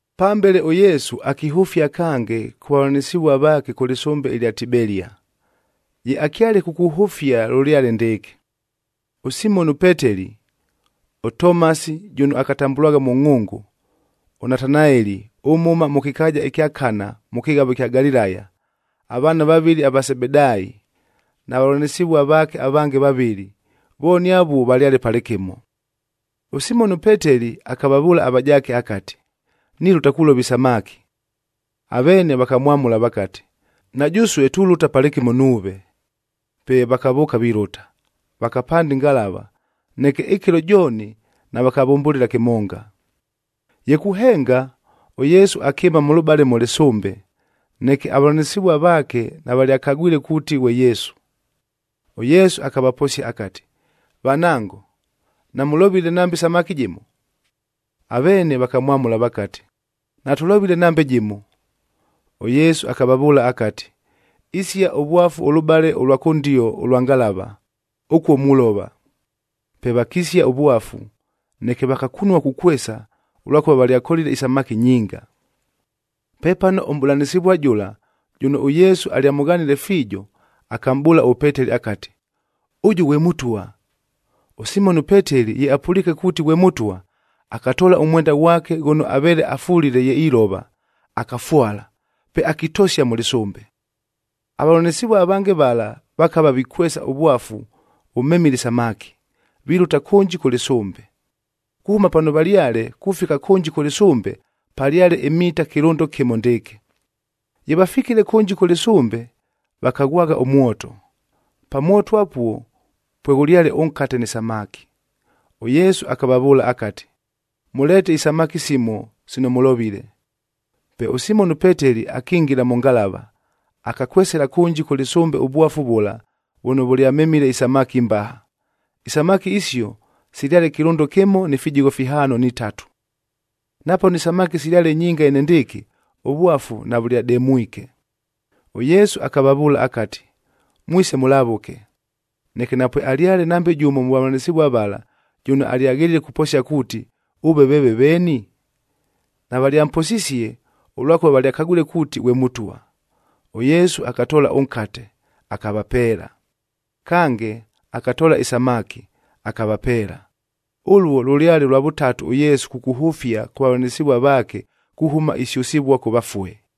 Pambele, ʉYesu akihʉfia kange kʉ vavʉlanɨsɨvua vaake kʉ lɨsʉmbe ɨlya Tibelia.a Ye akyale kukuhʉfia lʉlyale ndɨɨkɨ: ʉSimoni ʉPeteli, ʉTomasi jʉno akatambʉlwagha Mʉngʼhʉngʉ, ʉNatanaeli ʉmhʉma mʉ kɨkaaja ɨkya Kana mʉ kɨghavo ɨkya Galilaya, avaana vavɨlɨ ava Sebedaayib na vavʉlanɨsɨvua vaake avange vavɨlɨ, vooni avuo valyale palɨkɨmo. ɄSimoni ʉPeteli akavavʉʉla avajaake akati, “Nilʉta kulova isamaki.” Aveene vakamwamʉla vakati, “Na jʉsue tulʉta palɨkɨmo nuuve.” Pe vakavʉʉka vilʉta, vakapanda ɨngalava, neke ɨkɨlo jooni, navakambʉlɨla kɨmonga. Ye kuhenga, ʉYesu akɨɨma mʉlʉbale mʉ lɨsʉmbe, neke avavʉlanɨsɨvua vaake navalyakagwile kuuti ghwe Yesu. ɄYesu akavaposia akati, “Vanango, namʉlovile nambe samaki jɨmo?” Aveene vakamwamʉla vakati, “Natʉlovile nambe jɨmo!” ɄYesu akavavʉʉla akati, “Isia ʉvwafu ʉlʉbale ʉlwa kʉndio ʉlwa ngalava, ʉkuo mulova.” Pe vakisia ʉvwafu, neke vakakunua kukwesa, ʉlwakʉva valyakolile isamaki nyinga. Pepano ʉmʼbʉlanɨsɨvua jʉla, jʉno ʉYesu alyamʉghanile fiijo, akamʼbʉʉla ʉPeteli akati, “Ʉjʉ ghwe Mʉtwa!” ɄSimoni ʉPeteli ye apʉliike kuuti ghwe Mʉtwa, akatoola ʉmwenda ghwake ghʉno aveele afulile ye ilova, akafwala, pe akitosia mʉ lɨsʉmbe. Avavʉlanɨsɨvua avange vala vakava vikwesa ʉvwafu vʉmemile isamaki, vilʉta kʉnji kʉ lɨsʉmbe. Kuhʉma pano valyale, kufika kʉnji kʉ lɨsʉmbe, palyale imita kɨlʉndo kɨmo ndɨɨkɨ. Ye vafikile kʉnji kʉ lɨsʉmbe, vakaghwagha ʉmwoto. Pa mwoto apuo pweghʉlyale ʉnkate ni samaki. ɄYesu akavavʉʉla akati, “Mʉleete isamaki simo sino mʉlovile.” Pe ʉSimoni ʉPeteli akingila mʉ ngalava, akakwesela kʉnji kʉ lɨsʉmbe ʉvwafu vʉla vʉno vʉlyamemile isamaki imbaha. Isamaki isio silyale kɨlʉndo kɨmo ni fijigho fihaano ni tatu. Napano isamaki silyale nyinga enendɨɨkɨ, ʉvwafu navʉlyademwike. ɄYesu akavavʉʉla akati, “Mwise mʉlavʉke.” Neke napwealyale nambe jʉmo mʉ vavʉlanɨsɨvua vala, jʉno alyaghelile kuposia kuuti, “Ʉve veeve veeni?” Navalyamposisie, ʉlwakʉva valyakagwile kuuti ghwe Mʉtwa. ɄYesu akatoola ʉnkate, akavapeela. Kange, akatoola ɨsamaki, akavapeela. Ʉluo lʉlyale lwa vʉtatu ʉYesu kukuhʉfia kʉ vavʉlanɨsɨvua vaake, kuhʉma isyʉsɨvua kʉ vafue.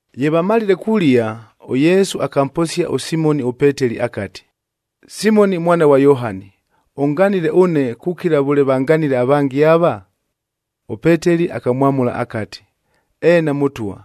Ye vamalile kulia, ʉYesu akamposia ʉSimoni ʉPeteli akati, “Simoni mwana ghwa Yohani, ʉnganile ʉne kukila vʉle vanganile avange ava?” ɄPeteli akamwamʉla akati, “Eena Mʉtwa,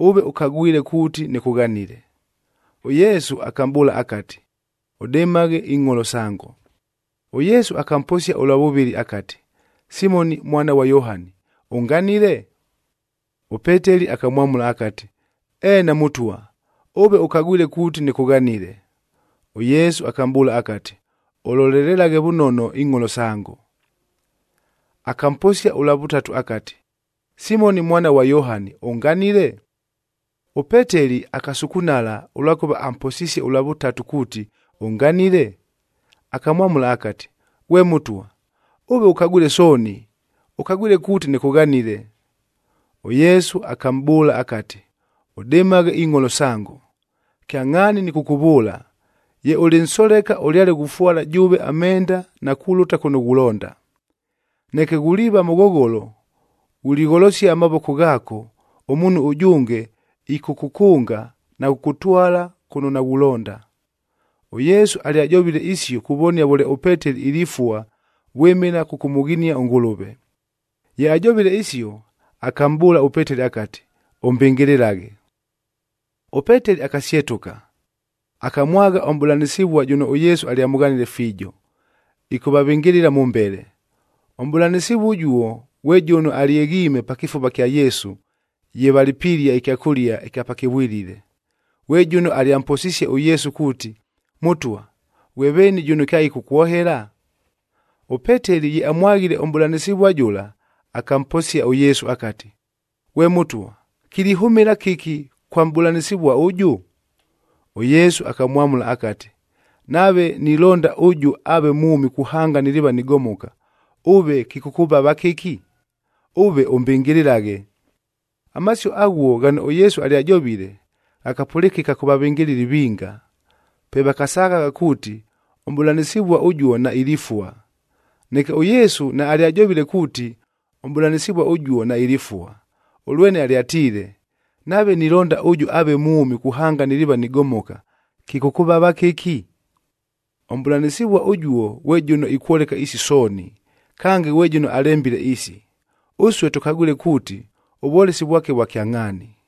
ʉve ʉkagwile kuuti nɨkʉghanile.” ɄYesu akamʼbʉʉla akati, “Ʉdɨmaghe ingʼholo sango.” ɄYesu akamposia ʉlwa vʉvɨlɨ akati, “Simoni mwana ghwa Yohani, ʉnganile?” ɄPeteli akamwamʉla akati, “Eena Mʉtwa, ʉve ʉkagwile kuuti nɨkʉghanile.” ɄYesu akamʼbʉʉla akati, “Ʉlolelelaghe vʉnono ingʼholo sango.” Akamposia ʉlwa vʉtatu akati, “Simoni mwana ghwa Yohani, ʉnganile?” ɄPeteli akasukunala, ʉlwakʉva amposisie ʉlwa vʉtatu kuuti, “Ʉnganile?” Akamwamʉla akati, “Ghwe Mʉtwa, ʉve ʉkagwile sooni, ʉkagwile kuuti nɨkʉghanile.” ɄYesu akamʼbʉʉla akati, “Ʉdɨmaghe ingʼholo sango. Kyangʼhaani nɨkʉkʉvʉʉla, ye ʉlɨ nsoleka ʉlyale ghufwala jʉʉve amenda na kulʉta kʉno ghulonda. Neke ghuliiva mʉghogholo, ghuligholosia amavoko ghaako, ʉmuunhu ʉjʉnge ɨkʉkʉkʉnga na kʉkʉkʉtwala kʉno naghulonda.” ɄYesu alyajovile isio kuvonia vʉle ʉPeteli ilifua vwɨmɨla kʉkʉmʉghinia ʉNgʉlʉve. Ye ajovile isio, akamʼbʉʉla ʉPeteli akati, “Ʉmbɨngɨlɨlaghe.” ɄPeteli akasyetʉka, akamwagha ʉmʼbʉlanɨsɨvua jʉno ʉYesu alyamʉghanile fiijo, ɨkʉvavɨngɨlɨla mʉmbele. Ʉmʼbʉlanɨsɨvua ʉjuo ghwe jʉno alyeghiime pa kɨfuva kya Yesu ye valɨ pilia ɨkyakʉlia ɨkya pakɨvwilile,c ghwe jʉno alyamposisie ʉYesu kuuti, “Mʉtwa, ghwe veeni jʉno kyaɨkʉkwohela?” ɄPeteli ye amwaghile ʉmʼbʉlanɨsɨvua jʉla, akamposia ʉYesu akati, “Ghwe Mʉtwa, kilihʉmɨla kɨki kwa mʼbʉlanɨsɨvua ʉjʉ?” ɄYesu akamwamʉla akati, “Nave nilonda ʉjʉ aave mwʉmi kuhanga niliiva nigomoka, ʉve kɨkʉkʉvava kɨki? Ʉve mbɨngɨlɨlaghe.” Amasio aghuo ghano ʉYesu alyajovile, ghakapʉlɨkɨka kʉ vavɨngɨlɨli vinga, pe vakasaghagha kuuti, ʉmʼbʉlanɨsɨvua ʉjuo nailifua. Neke ʉYesu naalyajovile kuuti, ʉmʼbʉlanɨsɨvua ʉjuo nailifua, ʉlwene alyatiile, “Nave nilonda ʉjʉ aave mwʉmi kuhanga niliiva nigomoka, kɨkʉkʉvava kɨki?” Ʉmʼbʉlanɨsɨvua ʉjuo ghwe jʉno ikwoleka isi sooni, kange ghwe jʉno alembile isi. Ʉsue tʉkagwile kuuti ʉvwolesi vwake vwa kyangʼhaani.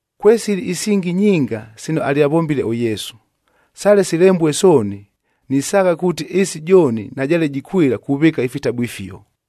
Kwesili isingi nyinga sino alyavombile ʉYesu. Sale silembue sooni, nisaagha kuuti ɨɨsi jooni najaale jikwɨla kuvɨɨka ifitabu ifio.